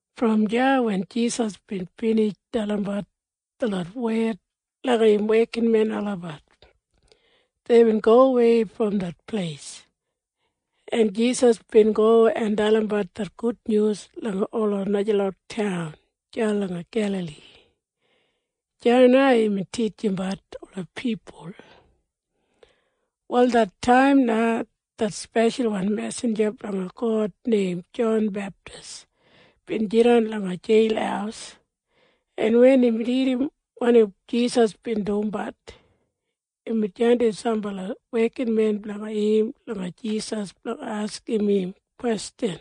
Brom deya wen Jisas bin binij dalimbat detlot wed langa im wekinmen olabat, deibin gowei brom det pleis, en Jisas bin go en dalimbat det gudnyus langa ola najalot taun deya langa Gelali. Deya na imbin titjimbat ola pipul. Wal det taim na det speshalwan mesinja blanga God neim Jon Beptis bin jidan langa jeil, en wen imbin irrim wanim Jisas bin dumbat, imbin jandim sambala wekinmen blanga im langa Jisas blanga askim im kwestjan,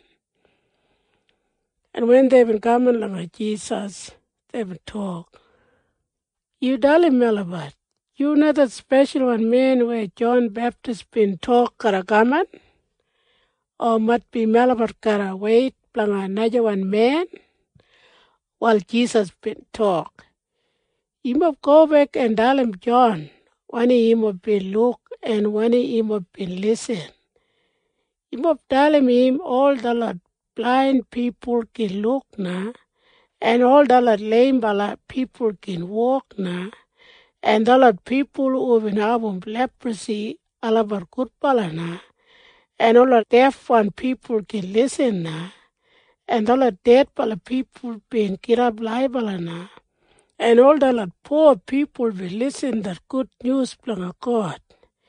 en wen deibin kaman langa Jisas, deibin tok, “Yu dalim melabat. Yu na det Speshalwan Men weya Jon Beptis bin tok garra kaman? O maitbi melabat garra weit blanga najawan men?” Wal Jisas bin tok, “Yumob gobek en dalim Jon wanim yumob bin luk en wanim yumob bin lisin. Yumob dalim im ol detlot blain pipul gin luk na, en ol detlot leimbala pipul gin wok na, en detlot pipul hubin abum leprasi olabat gudbala na, en ola defwan pipul gin lisin na, en detlot dedbala pipul bin gidap laibala na, en ol detlot po pipul bin lisin det gudnyus blanga God.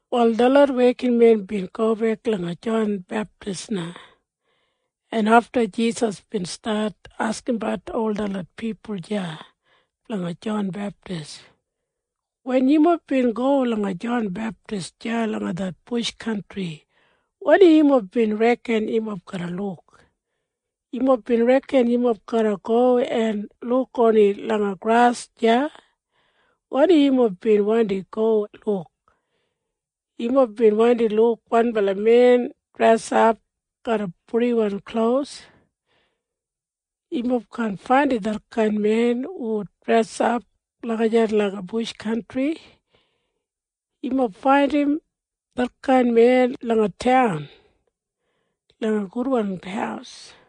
Wal detlot wekinmen bin gobek langa Jon Beptis na, en afta Jisas bin stat askimbat ol detlot pipul deya blanga Jon Beptis, “Wen yumob bin go langa Jon Beptis deya langa det bush kantri, wanim yumob bin reken yumob garra luk? Yumob bin reken yumob garra go en luk oni langa gras deya? Wanim yumob bin wandi go luk? Yumob bin wandi luk wanbala men dresap garra purdiwan klos? Yumob kaan faindim detkain men hu dresap lagijat langa bush kantri. Yumob faindim detkain men langa taun langa gudwan haus.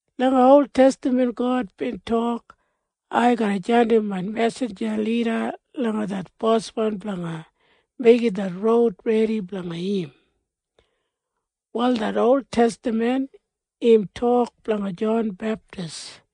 Langa oltestaman God bin tok, ‘Ai garra jandim main mesinja lida langa det Boswan blanga meigim det roud redi blanga im.’ Wal det oltestaman im tok blanga Jon Beptis.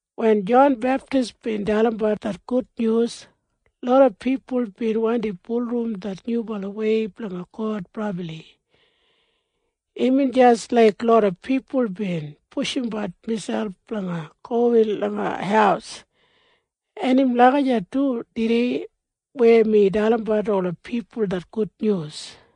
Wen Jon Beptis bin dalimbat det gudnyus, loda pipul bin wandi bulurrum det Nyubalawei blanga God brabli. Imbin jis laik loda pipul bin pushumbat miselp blanga gowin langa haus. En im lagijat du tudei weya mi dalimbat ola pipul det gudnyus.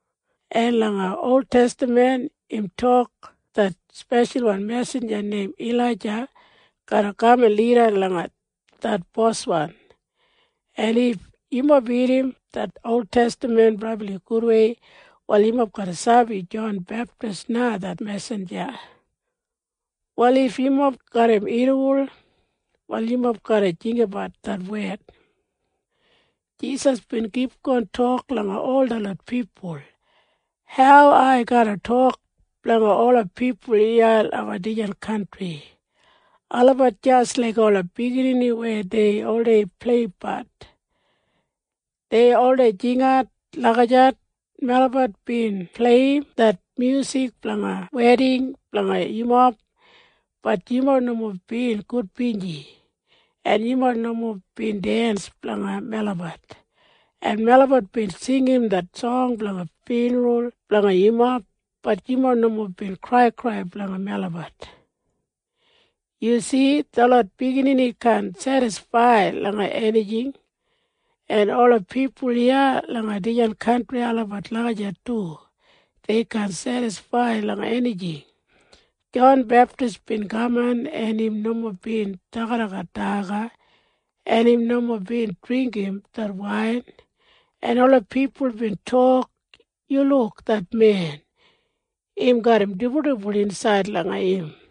En langa oltestaman im tok det speshalwan mesinja neim Ilaija garra kaman lida langa det boswan. En if yumob ridim det oltestaman brabli gudwei, wal yumob garra sabi Jon Beptis na det mesinja. Wal if yumob garram irriwol, wal yumob garra jinggabat det wed.” Jisas bin kipgon tok langa ol detlot pipul, “Hau ai garra tok blanga ola pipul iya langa dijan kantri? Olabat jis laik ola biginini weya dei oldei pleipleibat. Dei oldei jingat lagijat, ‘Melabat bin pleiyim det myusik blanga weding blanga yumob. Bat yumob nomo bin gudbinji, en yumob nomo bin dens blanga melabat. En melabat bin singim det song blanga fyunral blanga yumob. Bat yumob nomo bin kraikrai blanga melabat.’ Yu si? Detlot biginini kaan sedisfaid langa enijing. En ola pipul iya langa dijan kantri olabat lagijat du. Dei kaan sedisfaid langa enijing. Jon Beptis bin kaman, en im nomo bin dagadagat daga, en im nomo bin dringgim det wain, en ola pipul bin tok, ‘Yu luk det men. Im garram dibuldibul insaid langa im.’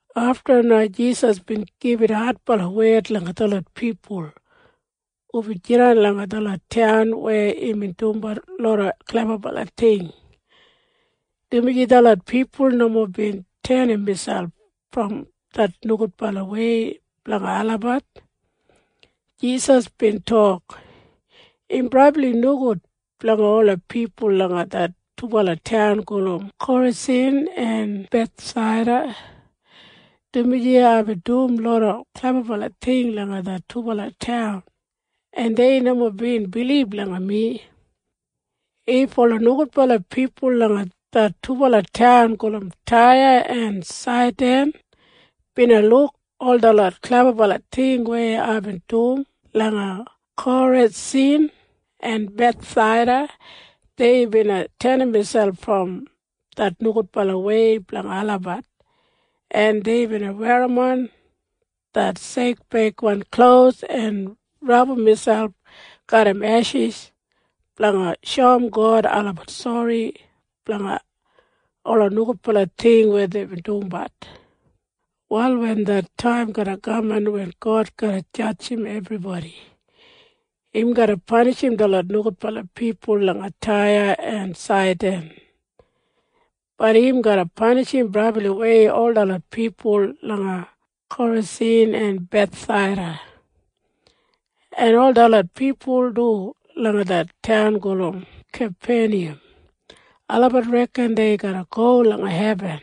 Afta na Jisas bin gibit adbala wed langa detlot pipul hubin jidan langa detlot taun weya imbin dumbat loda klebabala ting, dumaji detlot pipul nomo bin tenim miselp brom det nogudbalawei blanga olabat. Jisas bin tok, “Im brabli nogud blanga ola pipul langa det dubala taun gulum Korasin en Bethsaida, dumaji aibin dum loda klebabala ting langa det dubala taun, en dei nomo bin bilib langa mi. If ola nogudbala pipul langa det dubala taun gulum Taya en Saidan bina luk ol detlot klebabala ting weya aibin dum langa Korasin en Bethsaida, dei bina tenim miselp brom det nogudbalawei blanga olabat, en dei bina werrimon det sekbeigwan klos en rabum miselp garram eshis blanga shoum God olabat sori blanga ola nogudbala ting weya deibin dumbat. Wal wen det taim garra kaman wen God garra jadjim ebribodi, im garra panishim detlot nogudbala pipul langa Taya en Saidan. Bat im garra panishim brabliwei ol detlot pipul langa Korasin en Bethsaida. “En ol detlot pipul du langa det taun gulum Kapeniyam, olabat reken dei garra go langa hebin.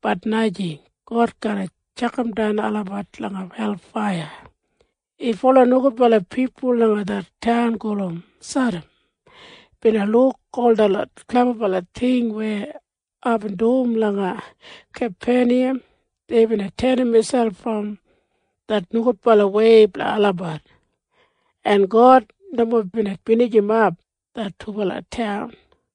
Bat najing. God garra tjakamdan olabat langa helfaiya. If ola nogudbala pipul langa det taun gulum Sadam bina luk ol detlot klebabala ting weya aibin dum langa Kapeniyam, dei bina tenim miselp brom det nogudbalawei blanga olabat, en God nomo bina binijimap det dubala taun.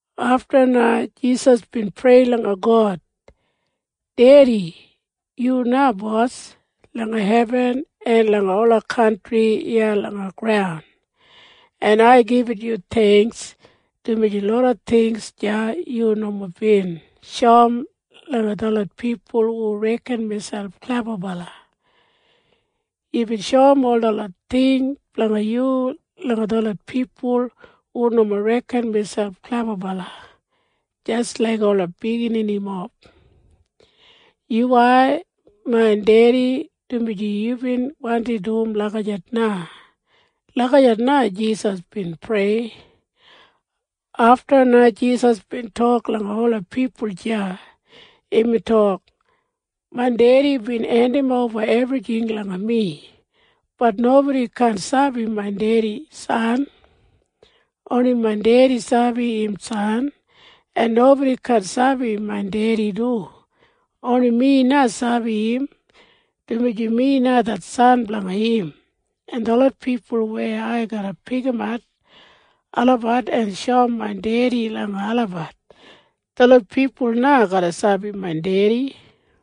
Afta na Jisas bin prei langa God, “Dedi, yu na Bos langa hebin en langa ola kantri iya langa graun, en ai gibit yu theingks, dumaji loda ting deya yu nomo bin shoum langa detlot pipul hu reken miselp klebabala. Yubin shoum ol detlot ting blanga yu langa detlot pipul hu nomo reken miselp klebabala, jis laik ola bigininimob. Yuwai, main Dedi, dumaji yubin wandi dum lagijat na.” Lagijat na Jisas bin prei. Afta na Jisas bin tok langa ola pipul deya. Imbin tok, “Main Dedi bin hendimoba ebrijing langa mi. Bat nobodi kaan sabi main Dedi San. Oni main Dedi sabi im San. En nobodi kaan sabi main Dedi du. Oni mi na sabi im, dumaji mi na det San blanga im. En detlot pipul weya ai garra pikimat olabat en shoum main Dedi langa olabat, detlot pipul na garra sabi main Dedi.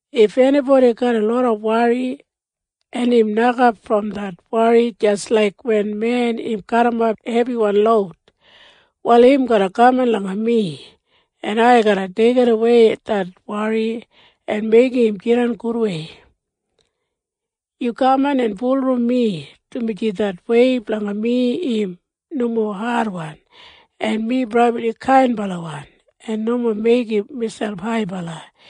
“If enibodi garram loda wori, en im nokap brom det wori jis laiga men weya im garrimap hebiwan loud, wal im garra kaman langa mi, en ai garra deigidawei det wori, en meigim im jidan gudwei. Yu kaman en bulurrum mi, dumaji det wei blanga mi im nomo adwan, en mi brabli kainbalawan en nomo meigim miselp haibala.